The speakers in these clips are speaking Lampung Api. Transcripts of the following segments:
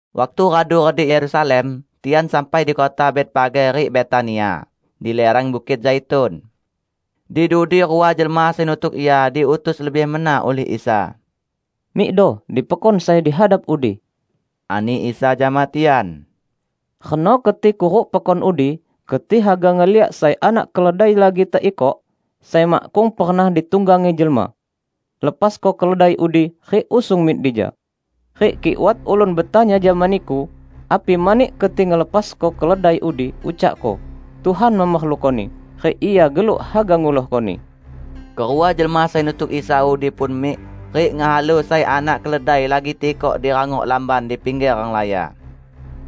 Waktu radu redik Yerusalem, tian sampai di kota Betfage rik Betania, di lireng Bukit Zaitun. Di dudi rua jelma sai nutuk Ia diutus lebih mena ulih Isa. "Mikdo di pekon sai di hadap udi," ani Isa jama tian. "Reno keti kuruk pekon udi, keti haga ngeliak sai anak keledai lagi teikok, sai makkung pernah ditunggangi jelma. Lepasko keledai udi rik usung mik dija. Rik kik wat ulun betanya jama niku api mani keti ngelepasko keledai udi, ucakko, 'Tuhan memerlukoni, rik Ia geluk haga ngulohkoni.' " Kerua jelma sai nutuk Isa udi pun mik, rik ngehalu sai anak keledai lagi teikok di rangok lamban di pingger renglaya.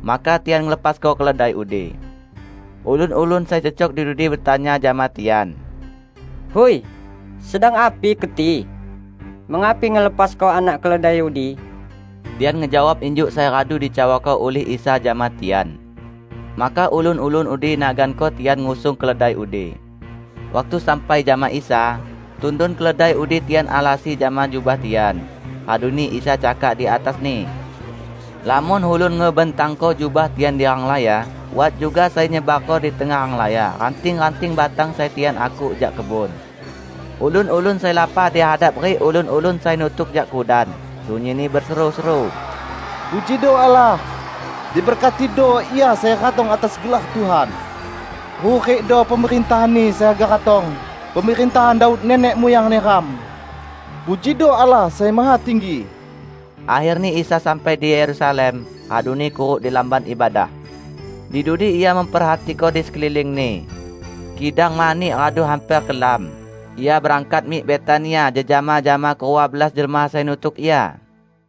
Maka tian ngelepasko keledai udi. Ulun-ulun sai cecok di dudi betanya jama tian, "Hui, sedang api keti? Mengapi ngelepasko anak keledai udi?" Tian ngejawab injuk sai radu dicawako ulih Isa jama tian. Maka ulun-ulun udi naganko tian ngusung keledai udi. Waktu sampai jama Isa, tundun keledai udi tian alasi jama jubah tian, raduni Isa cakak di atasni. Lamon ulun ngebentangko jubah tian di renglaya, wat juga sai nyebarko di tengah renglaya ranting-ranting batang sai tian akuk jak kebun. Ulun-ulun sai lapah di hadap rik ulun-ulun sai nutuk jak kudan, sunyinni beseru-seru, "Pujido Allah! Diberkatido Ia sai ratong atas gelar Tuhan! Hurikdo pemerintahan-Ni sai haga ratong -- pemerintahan Daud nenek muyang neram! Pujido Allah Sai Mahatinggi!" Akherni Isa sampai di Yerusalem, raduni kuruk di Lamban Ibadah. Di dudi Ia memperhatiko di sekeliling-Ni. Kidang mani radu hamper kelam, Ia berangkat mik Betania jejama jama kerua belas jelma sai nutuk Ia.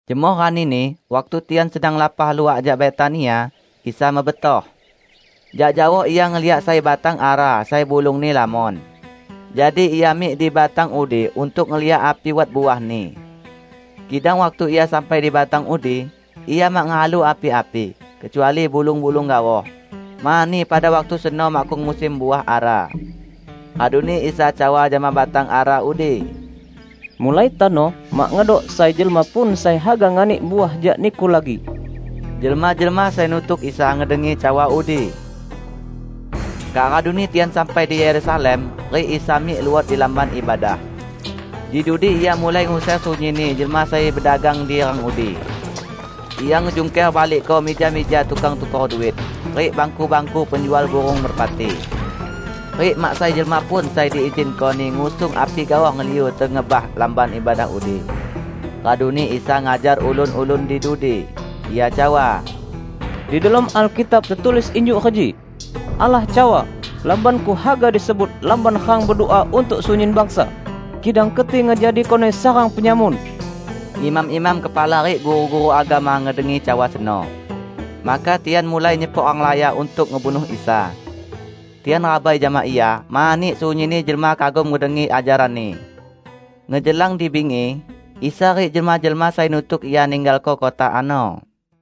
Jemoh ranini, waktu tian sedang lapah luah jak Betania, Isa mebetoh. Jak jaoh Ia ngeliak sai batang ara sai bulungni lamon. Jadi Ia mik di batang udi untuk ngeliak api wat uahni. Kidang waktu Ia sampai di batang udi, Ia mak ngehalu api-api, kecuali bulung-bulung gaoh, mani pada waktu seno makkung musim uah ara. Raduni Isa cawa jama batang ara udi, "Mulai tano mak ngedok sai jelma pun sai haga nganik uah jak niku lagi!" Jelma-jelma sai nutuk Isa ngedengi cawa udi. Kak raduni tian sampai di Yerusalem, rik Isa mik luot di Lamban Ibadah. Di dudi Ia mulai nguser sunyinni jelma sai bedagang di rang udi. Ia ngejungker balikko mija-mija tukang tukor duit, rik bangku-bangku penjual burung merpati. Rik mak sai jelma pun sai diizinko-Ni ngusung api gaoh ngeliu tengebah Lamban Ibadah udi. Raduni Isa ngajar ulun-ulun di dudi. Ia cawa, "Di delom Alkitab tetulis injuk reji: Allah cawa, 'Lamban-Ku haga disebut lamban rang bedua untuk sunyin bangsa.' Kidang keti ngejadikoni sarang penyamun!" Imam-imam kepala rik guru-guru agama ngedengi cawa seno. Maka tian mulai nyepok renglaya untuk ngebunuh Isa. Tian rabai jama Ia, mani sunyinni jelma kagum ngedengi ajaran-Ni. Ngejelang di bingi, Isa rik jelma-jelma sai nutuk Ia ninggalko kota ano.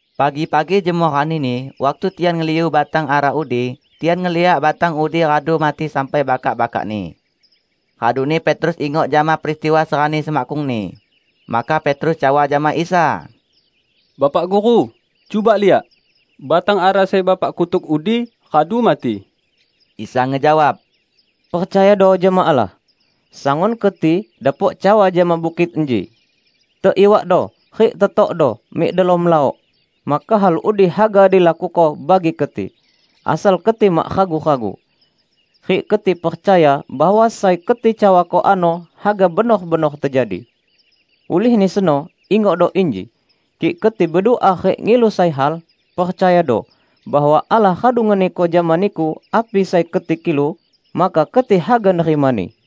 Pagi-pagi jemoh ranini, waktu tian ngeliu batang ara udi, tian ngeliak batang udi radu mati sampai bakak-bakakni. Raduni Petrus ingok jama peristiwa serani semakkungni. Maka Petrus cawa jama Isa, "Bapak Guru, cuba liak! Batang ara sai Bapak kutuk udi radu mati!" Isa ngejawab, "Percayado jama Allah. Sangun keti dapok cawa jama bukit inji, 'Teiwakdo rik tetokdo mik delom laok!' maka hal udi haga dilakuko bagi keti; asal keti mak ragu-ragu, rik keti percaya bahwa sai keti cawako ano haga benor-benor tejadi. Ulihni seno ingokdo inji: Kik keti bedua rik ngilu sai hal, percayado bahwa Allah radu ngeniko jama niku api sai keti kilu, maka keti haga nerimani.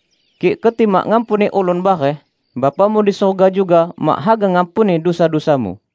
Kik keti mak ngampuni ulun bareh, Bapamu di surga juga mak haga ngampuni dusa-dusamu.]"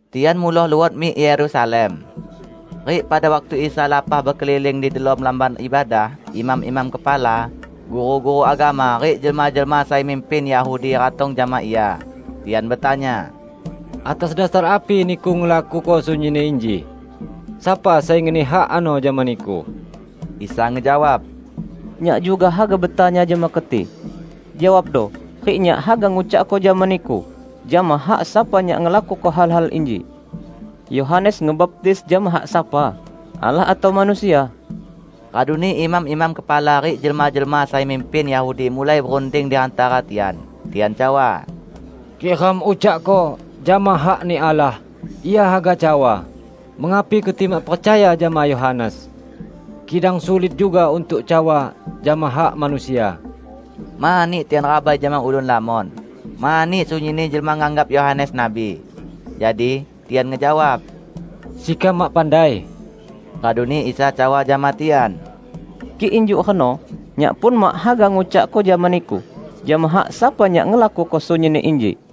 Tian muloh luot mik Yerusalem. Rik pada waktu Isa lapah bekeliling di delom Lamban Ibadah, imam-imam kepala, guru-guru agama rik jelma-jelma sai mimpin Yahudi ratong jama Ia. Tian betanya, "Atas dasar api Niku ngelakuko sunyinni inji? Sapa sai ngeni hak ano jama Niku?" Isa ngejawab, "Nyak juga haga betanya jama keti. Jawabdo rik Nyak haga ngucakko jama niku jama hak sapa Nyak ngelakuko hal-hal inji. Yohanes ngebaptis jama hak sapa, Allah atau manusia?" Raduni imam-imam kepala rik jelma-jelma sai mimpin Yahudi mulai berunding di hantara tian. Tian cawa, "Kik ram ucakko, 'Jama hak-Ni Allah,' Ia haga cawa, 'Mengapi keti mak percaya jama Yohanes?' Kidang sulit juga untuk cawa, 'Jama hak manusia.' " Mani tian rabai jama ulun lamon, mani sunyinni jelma nganggap Yohanes nabi. Jadi, tian ngejawab, "Sekam mak pandai." Raduni Isa cawa jama tian, "Kik injuk reno, Nyak pun mak haga ngucakko jama niku jama hak sapa Nyak ngelakuko sunyinni inji."